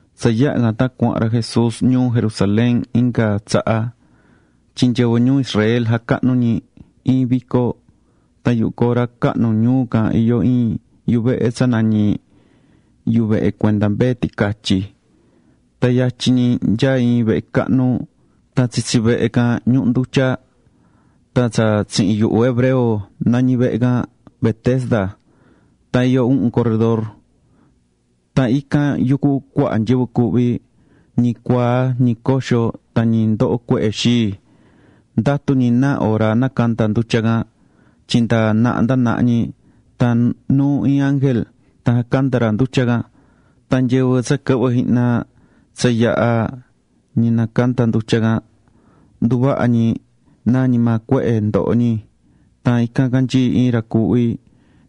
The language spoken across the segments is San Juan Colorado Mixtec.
Tsa yaha̱ can tan cuahán ra Jesús ñuu Jerusalén inga tsaha tyin nyɨvɨ ñuu Israel jacahnú ñi iin vico. Tan yuhu cora cahnu ñuu can iyó iin yuvehe tsa nañí Yuvehe Cuenda Mbee Ticatyi. Tan yatyin ñi nyaá iin vehe cahnu. Tan tsitsi vehe can ñuhú ndutya. Tan tsa tsihin yuhu hebreo nañí vehe can Betesda. Tan iyó uhun corredor. Tan ican yucú cuaha nyɨvɨ cuuhví: ñi cuaa, ñi coxo, tan ñi ndohó cuehe xii. Ndatú ñi náa hora nacanda ndutya can. Tyin nda naha nda naha ñi tan nuú iin ángel tan jacandá ra ndutya can. Tan nyɨvɨ tsa quɨhvɨ́ jihna tsa yaha̱ ñi nacandá ndutya can, nduvahá ñi vasu ndi maa cuehe cahnu ndohó ñi. Tan ican canyií iin ra cuuhví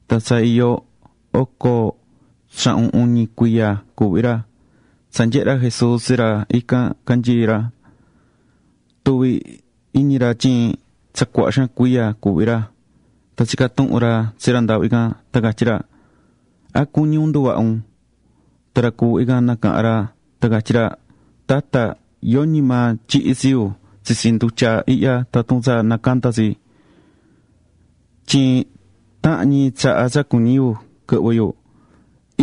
tan tsa iyó oco tsahun uñi cuiya cuuhví ra. Tsa nyehe̱ ra Jesús tsi ra ican canyií ra, tuvi̱ iñi ra tyin tsa cuaha xaan cuiya cuuhví ra. Tan tsica̱ tuhun ra tsi ra ndaahvi can, tan catyí ra: ―¿A cuñí un nduvaha un? Tan ra cuuhví can nacaha̱n ra tan catyí ra: ―Tata, yoñi maa tyihí tsi yu tsitsi ndutya ihya tatun tsa nacandá tsi. Tyin tahán ñi tsaha tsa cuñí yu quɨhvɨ yu,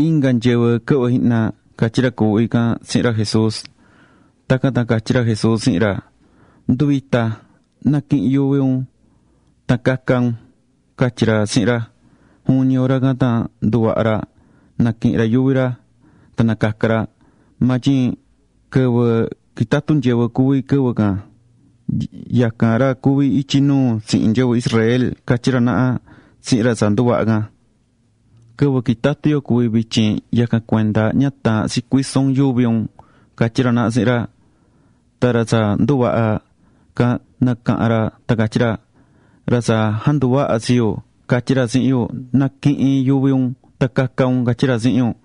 inga nyɨvɨ quɨhvɨ́ jihna ―catyí ra cuuhví can tsihin ra Jesús. Tacan tan catyí ra Jesús tsihin ra: ―Ndu̱vita, na̱quihin yuvi un tan ca̱ca un ―catyí ra tsihin ra. Juvin ñi hora can tan nduvaha̱ ra, naquihi̱n ra yuvi ra, tan nacaca̱ ra. Maa tyin quɨvɨ quitatú nyɨvɨ cuví quɨvɨ can. Yacan ra cuví ityi nuu tsihin nyɨvɨ Israel catyí ra naha tsihin ra tsa nduvaha̱ can: ―Quɨvɨ quitatú yo cuví vityin, yacan cuenda ña taahán tsi cuiso un yuvi un ―catyí ra naha tsihin ra. Tan ra tsa nduvaha̱ can nacaha̱n ra tan catyí ra: ―Ra tsa janduvaha̱ tsi yu, catyi̱ ra tsihin yu: “Na̱quihin yuvi un tan ca̱ca un”, catyí ra tsihin yu.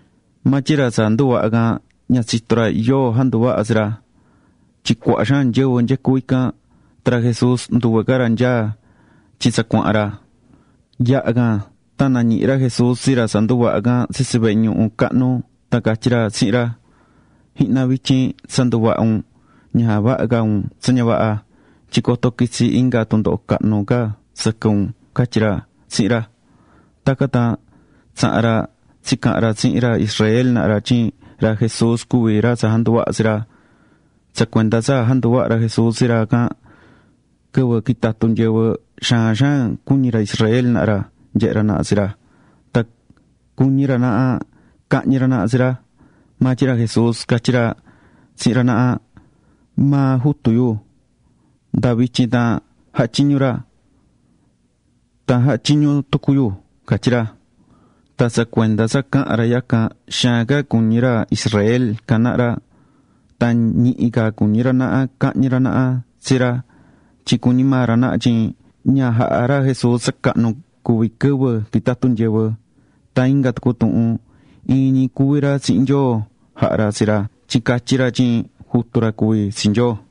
Maa tyin ra tsa nduvaha̱ can ña tsitó ra yóo janduvaha̱ tsi ra. Tyin cuaha xaan nyɨvɨ nyecú ican, tan ra Jesús nduve ca ra nyaá tyin tsa cuahán ra. Yaha̱ can tan nañihi̱ ra Jesús tsi ra tsa nduvaha̱ can tsitsi vehe ñuhu cahnu, tan catyí ra tsihin ra: ―Jihna, vityin tsa nduvaha̱ un, ña javaha ca un tsa ña vaha, tyin coto quitsi inga tundoho cahnu ca sɨquɨ un ―catyí ra tsihin ra. Tacan tan tsaha̱n ra tsicaha̱n ra tsihin ra Israel naha ra tyin ra Jesús cuví ra janduvaha̱ tsi ra. Tsa cuenda tsa janduvaha̱ ra Jesús tsi ra can quɨvɨ quitatú nyɨvɨ, xaan xaan cuñí ra Israel naha ra nyehe ra naha tsi ra. Tan cuñí ra naha cahñi ra naha tsi ra. Maa tyin ra Jesús catyí ra tsihin ra naha: ―Maa Jutu yu, nda vityin tan jahá tyiñu ra. Tan jahá tyiñu tucu yuhu ―catyí ra. Tan tsa cuenda tsa caha̱n ra yacan, xaan ca cuñí ra Israel can naha ra. Tan ñihi ca cuñí ra naha cahñi ra naha tsi ra tyin cuñí maa ra naha tyin ña jahá ra Jesús tsa cahnu cuví quɨvɨ quitatú nyɨvɨ, tan inga tucu tuhun, iin ñi cuví ra tsihin Nyoo jahá ra tsi ra tyin catyí ra tyin jutu ra cuví tsi Nyoo.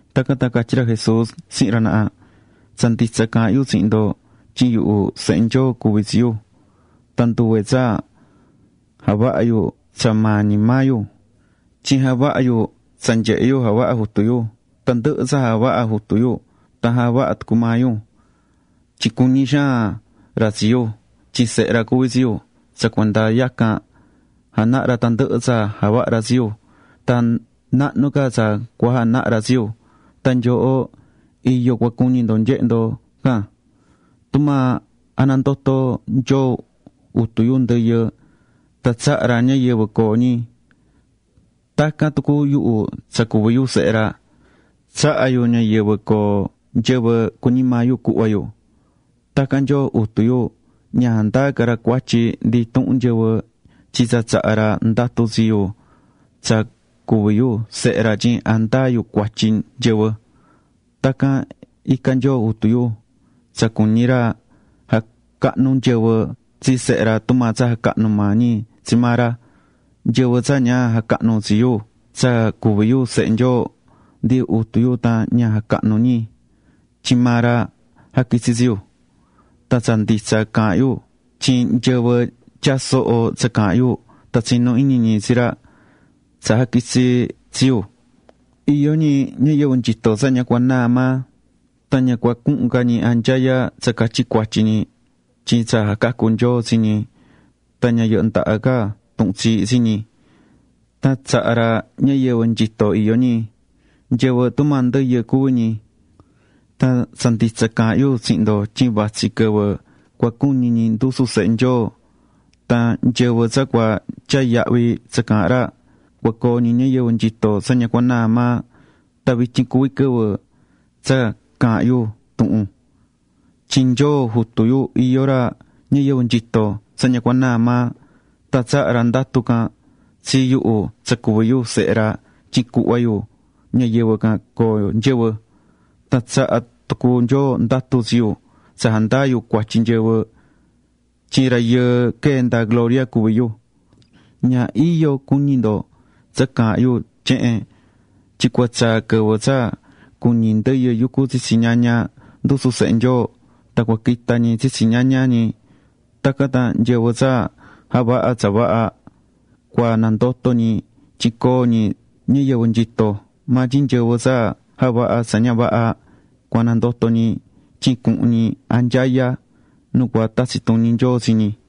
Tacan tan catyí ra Jesús tsihin ra naha: ―Tsa nditsa caahán yu tsihin ndo tyin yuhu, Sehe Nyoo cuví tsi yu, tan nduve tsa javahá yu tsa maa ñi maa yu. Tyin javahá yu tsa nyehé yu javahá Jutu yu. Tandɨhɨ tsa javahá Jutu yu tan javahá tucu maa yu. Tyin cuñí xaan ra tsi yu, tyin Sehe ra cuví tsi yu, tsa cuenda yacan janahá ra tandɨhɨ tsa javahá ra tsi yu. Tan nahnu ca tsa cua janaha ra tsi yu, tan nyooho iyo cua cuñi ndo nyehe ndo can. Tumaa janandotó Nyoo Jutu yu ndɨyɨ, tan tsahá ra ñayɨvɨ coo ñi, tacan tucu yuhu tsa cuví yu Sehe ra, tsahá yu ñayɨvɨ coo nyɨvɨ cuñí maa yu cuhva yu. Tacan Nyoo Jutu yu, ña jandaa ca ra cuatyi ndi intuhun nyɨvɨ tyin tsa tsaha̱ ra ndatu tsi yuhu tsa cuví yu Sehe ra tyin jandaa yu cuatyi nyɨvɨ. Tacan icá Nyoo Jutu yu tsa cuñí ra jacahnu nyɨvɨ tsi Sehe ra tumaa tsa jacahnú maa ñi tsi maa ra. Nyɨvɨ tsa ña jacahnú tsi yuhu tsa cuví yu Sehe Nyoo, ndi Jutu yu tan ña jacahnú ñi. Tyin maa ra jaquitsi̱ tsi yu. ’Tan tsa nditsa caahán yu tyin nyɨvɨ tyaá soho tsa caahán yu tan tsinú iñi ñi tsi ra tsa jaquitsi̱ tsi yu, iyó ñi ñayɨvɨ nyito tsa ña cua naa maa. Tan ña cua cuhun ca ñi anyaya tsa catyi cuatyi ñi tyin tsa jacacu̱ Nyoo tsi ñi tan ña yɨhɨ ndaha ca tuhun tsiihí tsi ñi, tan tsaha̱ ra ñayɨvɨ nyito iyó ñi. Nyɨvɨ; tumaa ndɨyɨ cuví ñi. Tan tsa nditsa caahán yu tsihin ndo tyin vatsí quɨvɨ cua cuñi ñi ndusu Sehe Nyoo. Tan nyɨvɨ tsa cua tyaa yahvi tsa caahán ra, cua coo ñi ñayɨvɨ nyito tsa ña cua naa maa. Tan vityin cuví quɨvɨ tsa caahán yu tuhun. Tyin Nyoo Jutu yu iyó ra ñayɨvɨ nyito tsa ña cua naa maa. Tan tsaha̱ ra ndatu can tsi yuhu tsa cuví yu Sehe ra tyin cuhva yu ñayɨvɨ can coo nyɨvɨ. Tan tsaha̱ tucu Nyoo ndatu tsi yu tsa jandaa yu cuatyi nyɨvɨ, tyin Rayɨɨ quee̱ nda gloria cuví yu. Ña iyo cu̱ñi ndo tsa caahán yu tyehen, tyin cua tsaa̱ quɨvɨ tsa cuñi ndɨyɨ yucú tsitsi ñaña ndusu Sehe Nyoo. Tan cua quita ñi tsitsi ñaña ñi. Tacan tan nyɨvɨ tsa javaha̱ tsa vaha cua nandoto ñi tyin coo ñi ñayɨvɨ nyitó. Maa tyin nyɨvɨ tsa javaha̱ tsa ña vaha cua nandoto ñi tyin cuhun ñi anyaya nu cua tatsi tuñi Nyoo tsi ñi.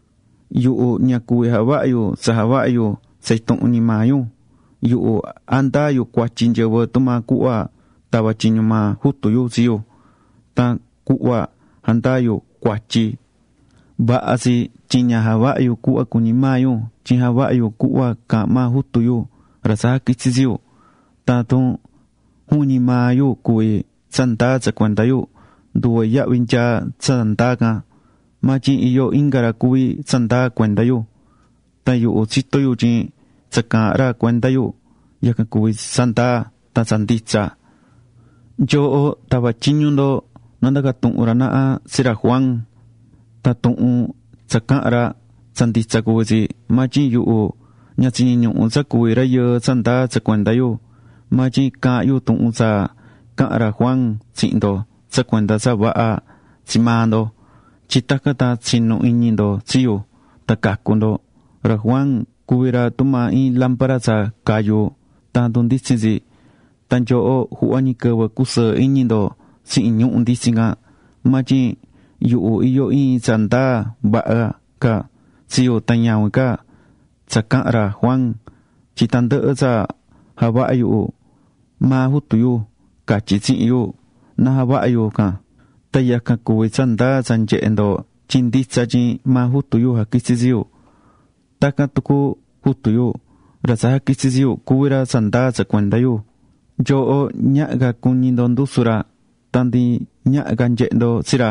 ’Yuhu ña cuví javaha yu tsa javahá yu tsa intuhun ñi maa yu. Yuhu jandaá yu cuatyi nyɨvɨ tumaa cuhva tava̱ tyiñu maa Jutu yu tsi yu. Tan cuhva jandaa yu cuatyi, vaha tsi, tyin ña javahá yu cuhva cuñí maa yu, tyin javahá yu cuhva caahán maa Jutu yu, ra tsa jaquitsi̱ tsi yu. Tan tatun juvin ñi maa yu cuví tsa ndaa tsa cuenda yu, nduve yahvi nyaá tsa ndaa can. Maa tyin iyó inga ra cuví tsa ndaa cuenda yu. Tan yuhu tsitó yu tyin tsa caahán ra cuenda yu, yacan cuví tsa ndaa tan tsa nditsa. Nyooho tava̱ tyiñu ndo na ndaca tuhun ra naha tsi ra Juan. Tan tuhun tsa caha̱n ra, tsa nditsa cuví tsi. Maa tyin yuhu ña tsiñiñuhu̱ tsa cuví rayɨɨ tsa ndaa tsa cuenda yu. Maa tyin caahán yu tuhun tsa caha̱n ra Juan tsihin ndo tsa cuenda tsa vaha tsi maa ndo, tyin tacan tan tsinu iñi ndo tsi yu tan cacu ndo. Ra Juan cuvi̱ ra tumaa iin lámpara tsa cayú tan jandunditsín tsi. Tan nyooho juhva ñi quɨvɨ cusɨɨ iñi ndo tsihin ñuhu̱ nditsin can. Maa tyin yuhu iyó iin tsa ndaa vaha ca tsi yu tan ñavin ca tsa caaha̱n ra Juan. Tyin tandɨhɨ tsa javahá yuhu, maa Jutu yu catyí tsihin yu na javaha yu can. Tan yacan cuví tsa ndaa tsa nyehé ndo tyin nditsa tyin maa Jutu yu jaquitsi̱ tsi yu. Tacan tucu Jutu yu, ra tsa jaquitsi̱ tsi yu, cuví ra tsa ndaa tsa cuenda yu. Nyooho ñaha ca cuñi ndo ndusu ra, tan ndi ñaha ca nyehe ndo tsi ra.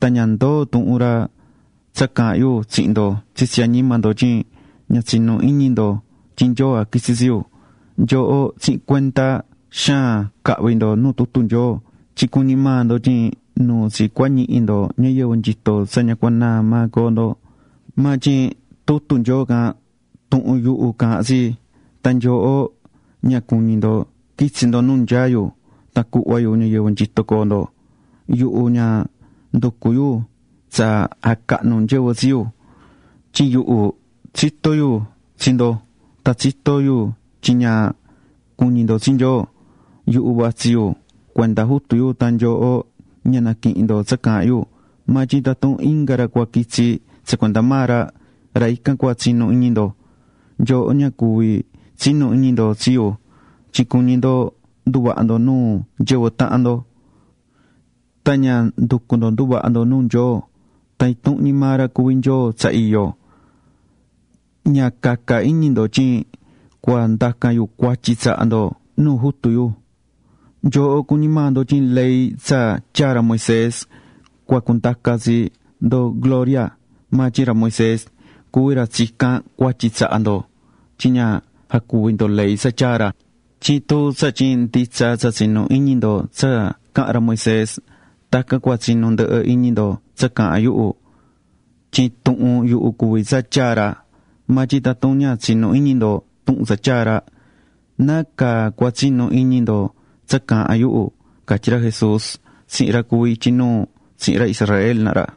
Tan ña ndoó tuhun ra tsa caahán yu tsihin ndo tsitsi añima ndo tyin ña tsinú iñi ndo tyin Nyoo jaquitsi̱ tsi yu. Nyooho tsihin cuenda xaan cahví ndo nu tutu Nyoo, tyin cuñí maa ndo tyin nuu tsi cua ñihi ndo ñayɨvɨ nyito tsa ña cua naa maa coo ndo. Maa tyin tutu Nyoo can, tuhun yuhu caahán tsi. Tan nyooho ña cuñí ndo quitsi ndo nu nyaá yu tan cuhva yu ñayɨvɨ nyito coo ndo. ’Yuhu ña nducú yu tsa jacahnu nyɨvɨ tsi yu. Tyin yuhu tsitó yu tsi ndo tan tsitó yu tyin ña cuñí ndo tsi Nyoo. Yuhu vatsí yu cuenda Jutu yu tan nyooho ña naquihín ndo tsa caahán yu. Maa tyin tatun inga ra cua quitsí tsa cuenda maa ra, ra ican cua tsinu iñi ndo. Nyooho ña cuví tsinu iñi ndo tsi yu tyin cuñí ndo nduvaha ndo nuu nyɨvɨ tahan ndo. Tan ña nducú ndo nduvaha ndo nuu Nyoo, tan intuhun ñi maa ra cuví Nyoo tsa iyó. Ña caca iñi ndo tyin cua ndacan yu cuatyi tsaha ndo nuu Jutu yu. Nyooho cuñí maa ndo tyin ley tsa tyaa̱ ra Moisés cua cundaca tsi ndo gloria. Maa tyin ra Moisés cuví ra tsicán cuatyi tsaha ndo tyin ña jacuví ndo ley tsa tyaa̱ ra. Tyin tun tsatyin nditsa tsa tsinú iñi ndo tsa caha̱n ra Moisés, tacan cua tsinu ndɨhɨ iñi ndo tsa caahán yuhu. Tyin tuhun yuhu cuví tsa tyaa̱ ra. Maa tyin tatun ña tsinú iñi ndo tuhun tsa tyaa̱ ra, ¿nácaa cua tsinu iñi ndo tsa caahán yuhu? ―catyí ra Jesús tsihin ra cuví ityi nuu tsihin ra Israel naha ra.